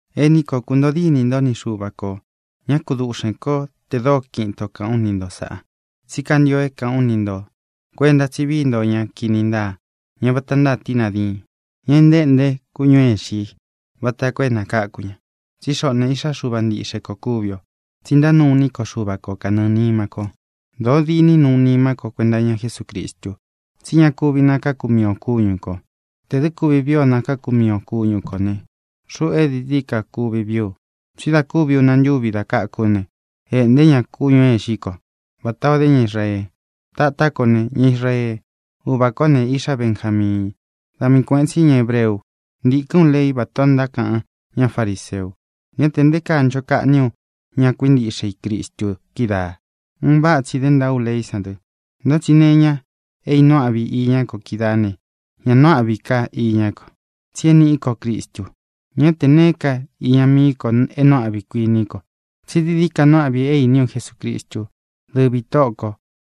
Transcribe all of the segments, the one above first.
Ení ko, kūntoo dínī ntó ni Xuva kō. Ñá kakuduꞌxēn kó te dóo kiꞌin itō kaꞌán u ni nto sāꞌa, tsí kantio é kāꞌán u ni ntō. Kuenta tsí vií nto ña kini ntáa, ña vata ntáa tínā diin, ña é ntaéꞌnte kúñū é īxi i vata koo é nākáku ña. Tsí xoꞌō ne, iꞌxá Xuva ntiꞌxe ko kúvi ō, tsi ntánuu iní ko Xuva ko kanɨɨ̄ nima ko. Dōo diní nuu nima ko kuenta iña Jesúcristu. Tsí ña kúvi nakākú mii ō kúñu kō. Tē dɨ́ kuvi vii o nakākú mii ō kúñu kō ne, xuꞌu é dií dií ka kuvi vií u. Tsí dā kuvi una ntúvī da káku ú ne, ēꞌnté ña kúñū é īxí ko vatā ó de ña Israee. Tatá ko ne, ña Israee. Uvā kó ne, iꞌxá Benjamiin. Da mii kuēꞌen tsí ña hebreu u. Ntīkɨ́n u lei vátā o ntákaꞌan ñá fariseu. Ñá tē nté kaa ncho kaꞌní u ña kuíntiꞌxe i Cristu kídaā. Un váꞌa tsi dé ntaa ú leí san dɨ. Ntá tsi nee iña é īnuu áꞌvi iñá ko kídaā ne, ña nuu áꞌvi ka iñá ko, tsi é nīꞌí ko Cristu. Ñá tē neé ka iña mií ko é nuu áꞌvi i, kuiní ko, tsí dií dií ka nuu áꞌvi é īní u Jesucristu, dɨ́vī Tóꞌō ko.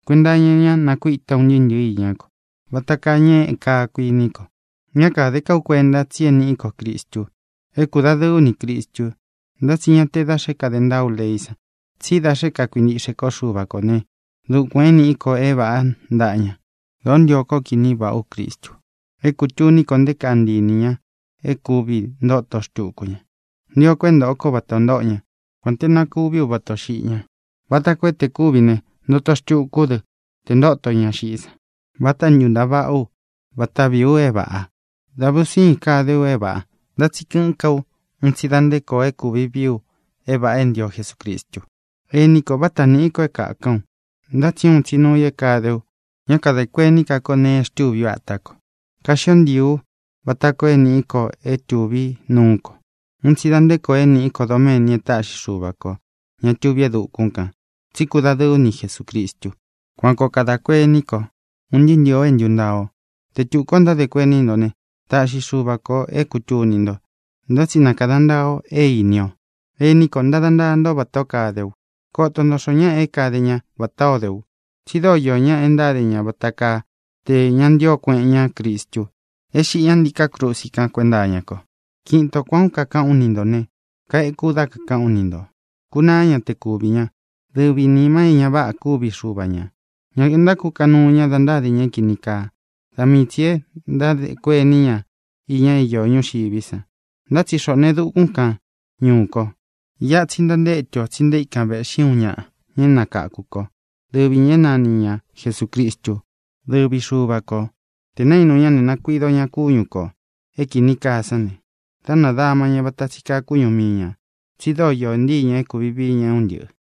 Kuenta iña ñá nakuíta ú un ntɨɨ́ ntɨ̄ɨ́ iñá ko. Vata kaa ñéꞌē kaa, kuiní ko. Ñá kāde ká u kuenta, tsi é nīꞌí ko Cristu. É kūdadɨɨ ú nī Cristu, ntá tsi ñá te da xe é kāde ntaa ú leí san, tsí da xe é kākuintiꞌxe kó Xuva kō né, dukuān é nīꞌí ko é vāꞌá ntaꞌa ña. Dōó ntio kó kiní vāꞌá u Cristu, é kūtuní ko nté kaa ntii inī ña é kūvi ntoto xtuku ña. Ntio ko é ntōꞌo kó vatā o ntóꞌo ña, kuān te na kuví u vatā o xiꞌi ñá, vata koo é, te kūvi ne, ntoto xtuku ú dɨ te ntóto ña xiꞌí san. Váta ntūntaa vaꞌá u; váta vīí u é vāꞌa. Da ve un sīin kade u é vāꞌa. Ntá tsi kɨꞌɨ́n ka ú un tsi da nte koo é kūvi vií u é vāꞌa é ntio Jesucristu. Ení ko, váta nīꞌí ko é kākaꞌán u. Ntá tsi uun tsi nuu i é kāde u: ñá kadē kuení ka ko nēe e xtûví u atá ko. Kaxío ntiī u vata koo é nīꞌí ko é tūví nuú ko. Un tsi da nte koo é nīꞌí ko doméni e táꞌxi Xuva kō, ña tuví e dukún kān, tsi kúdadɨɨ ú ni Jesūcristu. Kuan koo kadā kuení ko, ūn ntɨɨ́ ntɨ̄ɨ o é ntūntaa o. Te tukū ó ntádē kuení nto ne, taꞌxi Xuva kō é kūtuni nto. Ntá tsi na kāda ntaa o é īni o. Ení ko, ntada náa nto vatā ó kade u. Koto nto xoo ñáꞌa é kade ña vatā ó de u. Tsi dóo iō ñáꞌa e ntáde ña vata kaa tē ña ntío kueꞌen ña Cristu é xiꞌi ña ntiká krusi kan kuénta iña ko. Kiꞌin ito kuān ó kakaꞌán u ni ntō ne, kaeku ú dá kākaꞌán u ni ntō. Kūnaá ña te kuvī ña. Dɨvī nima é ñā váꞌa kúvi xuva ñā. Ña ntákukaꞌan nuu ña da ntáde ña é kīni kaa. Da mii tsī e ntádē kuení ña iña é īó ñuxiví san. Ntá tsi xoꞌō ne, e dúkūn kán ñuú kō. Iꞌa tsi ntantétu ō tsi nté ikan vēꞌxí uun ñaꞌa, ña é nakáku ko, dɨvi ñā é nani ña Jesūcristú, dɨvi Xuva kō. Tē naínu ña ne, nakuido ña kúñu kō é kīni kaa sán ne, dá nadāma ña vata tsi kaa kúñu mii ñā, tsi dóo īó ntii ña é kūvi vií ña é un ntɨꞌɨ̄.